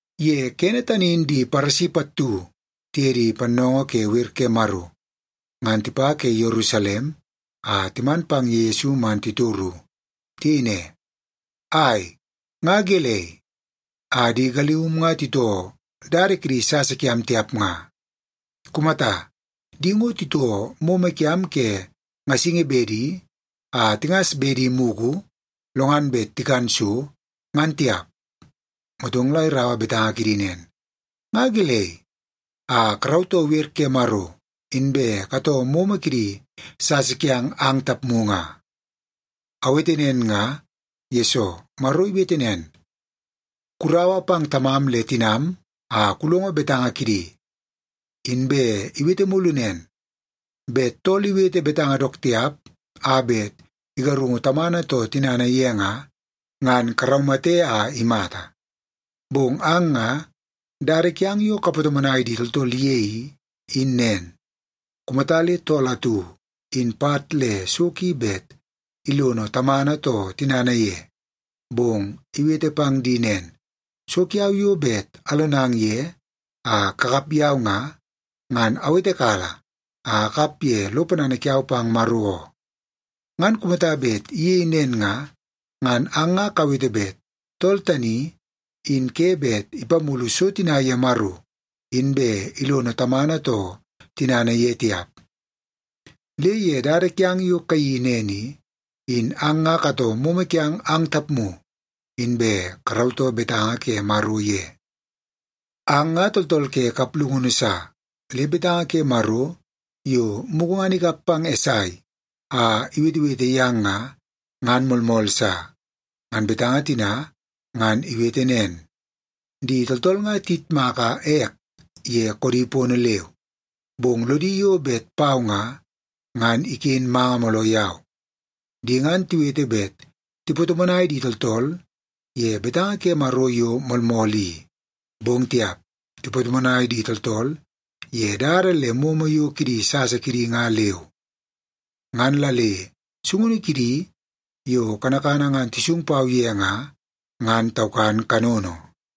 Ye kene tani in di Paresi pattu tiye di pannoongoo ke wer ke Maro, ngan tipa ke Yerusalem a timan pang ye Yesu man titoru. Tiyei ne, “Ai, nga gelei a di galium nga titoo dada kidi sasa kiam tiap nga? Kumata, di ngo titoo momo kiam ke ngasingi bede a tingas bedi mugu lo ngan bet tikan so, ngan tiap!” Motong la iraua betanga kidi nen, “Nga gelei a karautoo wer ke Maro, inbe katoo momo kidi sasa kiang ang tapmu nga? Awete nen nga, yesoo Maro iwete nen, ‘Kuraua pang tamam le tinam a kulongo betanga kidi.’ Inbe iwete mulu nen, ‘Bet tool iwete betanga dook tiap a bet igarungu tamana too tinana ye nga, ngan karaumate a imata.’ Bong ang nga dada kiang yo kapatomonai di tooltool ye i, in nen. Kumata le tool atu in pat le so ki bet ilono tamana too tinana ye, bong iwete pang di nen, ‘So kiau yo bet alonang ye a kakap yau nga, ngan awetekala a akap ye lo ponana kiau pang Maro oo,’ ngan kumata bet iyei nen nga, ngan ang nga kawete bet tool tani in ke bet ipamulu so tina ye Maro inbe ilono tamana too tinana ye tiap. Le ye dada kiang yo kayeii nen i, in ang nga katoo momo kiang ang tapmu, inbe karautoo betanga ke Maro ye. Ang nga tooltool ke kaplungunu sa! Le betanga ke Maro yo mugu ngan ikap pang Esai a iwetewete yang nga, ngan moolmool sa. Ngan betanga tina ngan iwete nen, ‘Di tooltool nga tiyitmaka ek ye koodi pono leu, bong lodi yo bet pau nga, ngan iken manga mooloo yau. Di ngan tiwete bet tipatomonai di tooltool ye betanga ke Maro yo moolmool i, bong tiap, tipatomonai di tooltool ye dada le momo yo ke di sasa kidi nga leu. Ngan la le sungunu kidi yo kanakana ngan tisung pau ye nga, ngan taukan kanono.’”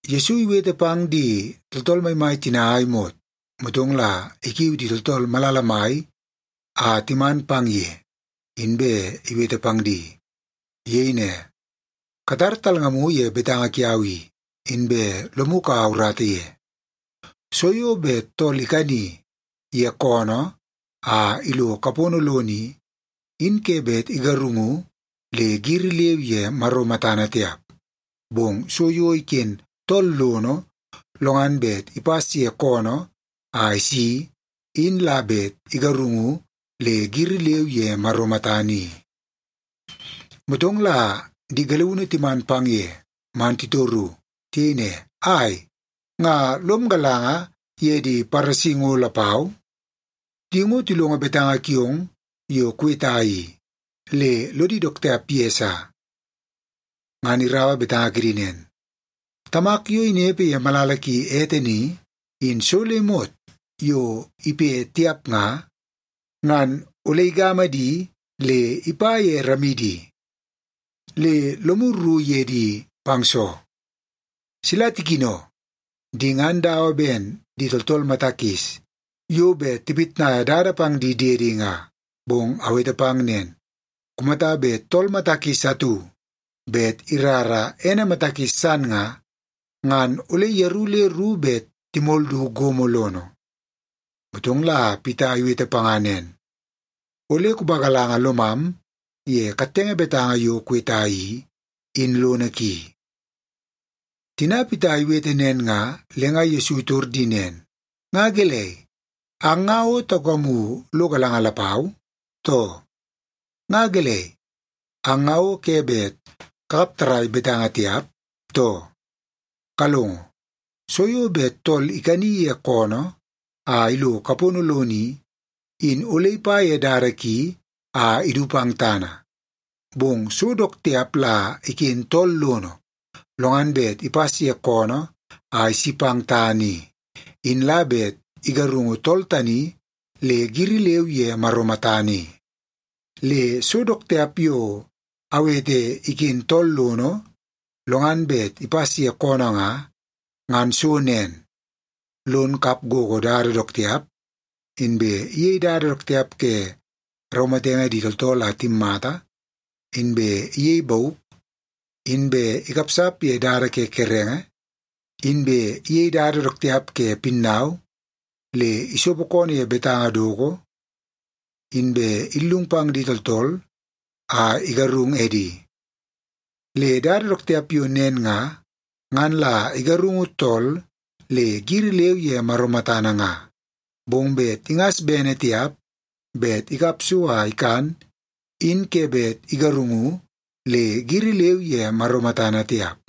Yesu iwete pang di tooltool maimai tina a imot, motong la ikiu di tooltool malala mai a timan pang ye, inbe iwete pang di. Iyei ne, “Katar talngamu ye betanga kiau i, inbe lomu kaua urata ye. So yo bet tool ikani ye koonoo a ilo kapono lono i, in ke bet igarungu le giri leu ye Maro matana tiap. Bong so yo iken tool lono, lo ngan bet ipas ye koonoo a isi in la bet igarungu le giri leu ye Maro matana i.” Motong la di galiunu timan pang ye man titoru. Tiyei ne, “Ai, nga lom galanga ye di Paresi ngo lapau? Di ngo tilongo betanga kiong yo kuweta i le lodi dook tiap ye sa.” Ngan iraua betanga kidi nen, “Tamak yo inepe ye malala ki ete ni, in so le imot yo ipe tiap nga, ngan ole igama di le ipa ye ramidi. Le lomu rru ye di pang soo? Sila tikino! Di ngan dawa ben di tooltool mata kis yo bet tipitnaia dada pang di diedi nga. Bong awete pang nen, kumata bet tool mata kis atu bet irara ene mata kis san nga, ngan ole yeru le ru, bet timol du gomo lono.” Motong la Pita iwete panga nen, “Ole kupagalanga lomam ye kattenge betanga yo kuweta i, in lono ki.” Tina Pita iwete nen nga, le nga Yesu itor di nen, “Nga gelei, ang nga o taukamu lo galanga lapau, too? Nga gelei, ang nga o ke bet kakap tarrai betanga tiap, too? Kalongo, so yo bet tool ikani ye koonoo a ilo kapono lono i, in ole ipa ye dada ki a idu pang tana. Bong so dook tiap la iken tool lono, lo ngan bet ipas ye koonoo a isi pang tana i, in la bet igarungu tool tani le giri leu ye Maro matana i. Le so dook tiap yo awete iken tool lono lo ngan bet ipas ye koonoo nga, ngan so nen: lon kap gogo dada dook tiap, inbe iyei dada dook tiap ke raumatenge di tooltool a timmata, inbe iyei bauk, inbe ikapsap ye dada ke kerenge, inbe iyei dada dook tiap ke pinnau, le isopo koonoo ye betanga doko, inbe illung pang di tooltool a igarung edi. Le dada dook tiap yo nen nga, ngan la igarungu tool le giri leu ye Maro matana nga. Bong bet ingas bene tiap bet ikap so a ikan, in ke bet igarungu le giri leu ye Maro matana tiap.”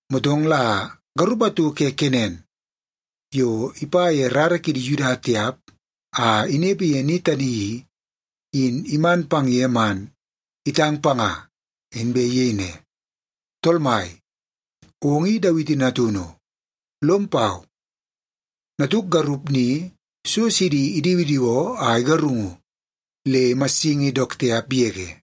Motong la garup atu ke Kenan yo ipa ye rara kidi Yuda tiap a inepe ye ni tani i, in iman pang ye man itang panga, inbe iyei ne, “Tool Mai, ong in Dawiti Natunu. Lom pau! Natuk garup ni so sidi idiwidiwoo a igarungu, le imassingi dook tiap yege.”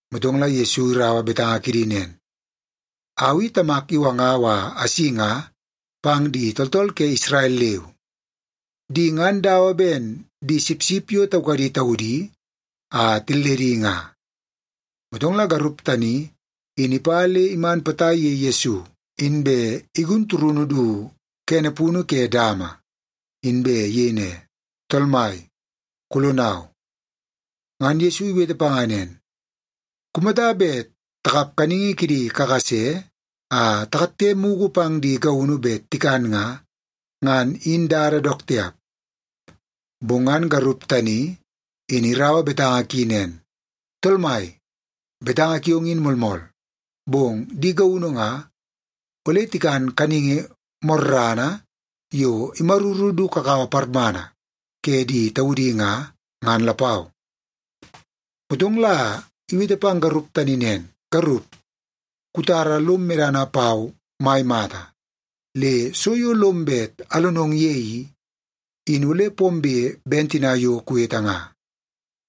Motong la iraua betanga kidi nen, “Au i Tamak iwangau a asi nga pang di tooltool ke Isrel leu. Di ngan dawa ben di sipsip yo taukadi taudi a tilledi nga.” Motong la garup tani in ipa le iman potai ye Yesu, inbe igun turunu du kene punu ke dama, inbe iyei ne, “Tool Mai, kulonau!” Ngan Yesu iwete panga nen, “Kumata bet takap kaningi kidi kakase a takatte mugu pang di gaunu bet tikan nga, ngan in dada dook tiap.” Bong ngan garup tani in iraua betanga ki nen, “Tool Mai, betanga kiong in moolmool. Bong di gaunu nga, ole tikan kaningi morrana yo imaruru du kakawa parmana ke di taudi nga, ngan lapau.” Motong la iwete pang garup tani nen, “Garup, kutara lom medana pau mai mata. Le so yo lom bet alonong ye i, in ole pombe ben tina yo kuwete nga.”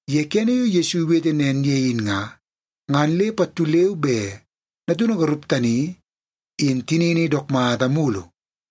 Ye kene yo Yesu iwete nen ye in nga, ngan le pattu leu be natunu garup tani in tinini dook mata mulu.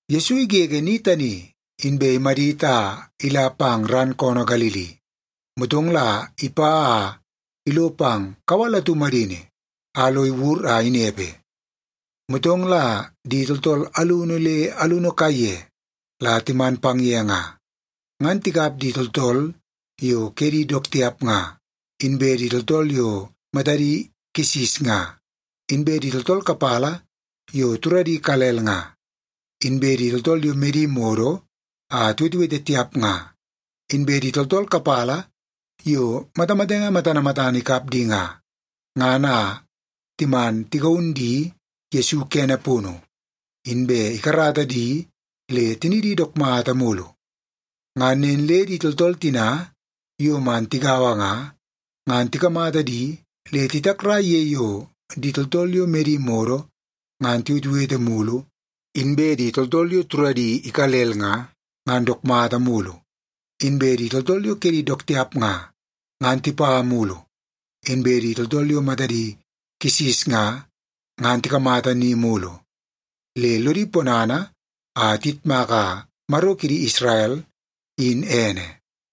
Yesu igege ni tani, inbe imadit a ila pang ran koonoo Galili. Motong la ipa a ilo pang kawal atu madini a lo iwur a inepe. Motong la di tooltool alunu le alunu kaiye la timan pang ye nga, ngan tikap di tooltool yo kedi dook tiap nga, inbe di tooltool yo matadi kisis nga, inbe di tooltool kapala yo turadi ikalel nga, inbe di tooltool yo medi modo a tiwetewete tiap nga, inbe di tooltool kapala yo matamatenge matana matana ikap di nga, ngan a timan tigaun di Yesu kene punu, inbe ikarata di le tinidi dook mata mulu. Ngan nen le di tooltool tina yo man tigaua nga, ngan tikamata di le titakrai ye yo di tooltool yo medi modo ngan tiwetewete mulu; inbe di tooltool yo turadi ikalel nga, ngan dook mata mulu; inbe di tooltool yo kedi dook tiap nga, ngan tipa mulu; inbe di tooltool yo matadi kisis nga, ngan tikamata ni mulu. Le lodi ponana a tiyitmaka Maro kidi Isrel, in ene.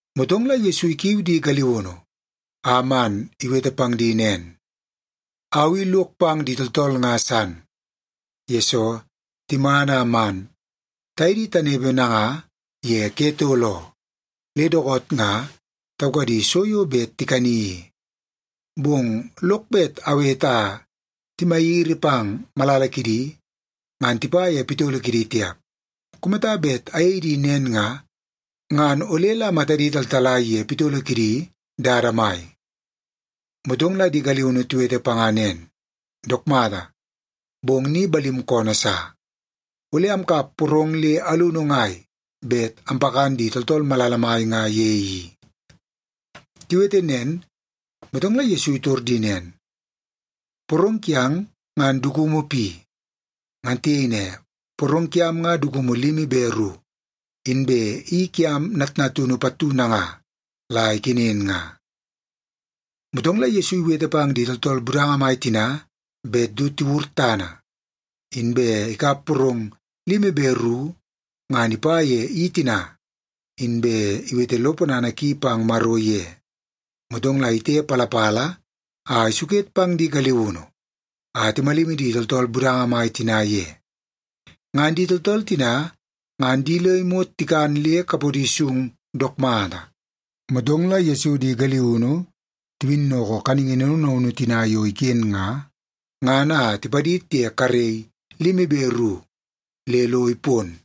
Motong la Yesu ikiu di galiunu a man iwete pang di nen, “Au i lok pang di tooltool nga san, yesoo timan a man taye di tanepe nanga ye ke tol oo, le dookoot nga taukadi so yo bet tikani i. Bong lok bet awete a timagiri pang malala kidi, ngan tipa ye pitolo kidi tiap. Kumata bet ayei di nen nga, ngan ole la matadi taltalai ye pitolo kidi dada mai.” Motong la di galiunu tiwete panga nen, “Dook mata, bong ni balim koonoo sa. Ole amkap porong le alunu ngai bet ampakan di tooltool malala mai nga ye i?” Tiwete nen, motong la Yesu itor di nen, “Porong kiang ngan dukumu pi?” Ngan tiyei ne, “Porong kiam nga dukumu limi be ru, inbe i kiam natnatunu pattu nanga la ikenen nga.” Motong la Yesu iwete pang di tooltool budanga mai tina bet du tiwur tana. Inbe ikap porong limi be ru ngan ipa ye i tina, inbe iwete lo ponana ki pang Maro ye. Motong la itepalapala a isuket pang di galiunu a timalimi di tooltool budanga mai tina ye. Ngan di tooltool tina ngan di le imot tikan le kapodi sung dook mata. Motong la Yesu di galiunu tiwinnoko kaningi naunu naunu tina yo iken nga, ngan a tipadid ye karei limi be ru le lo ipon.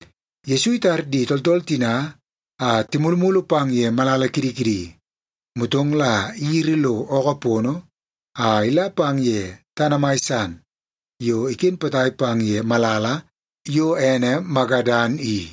Yesu itar di tooltool tina a timulumulu pang ye malala kidi kidi, motong la iyiri lo ookoo pono a ila pang ye tana mai san yo iken potai pang ye malala yo ene Magadan i.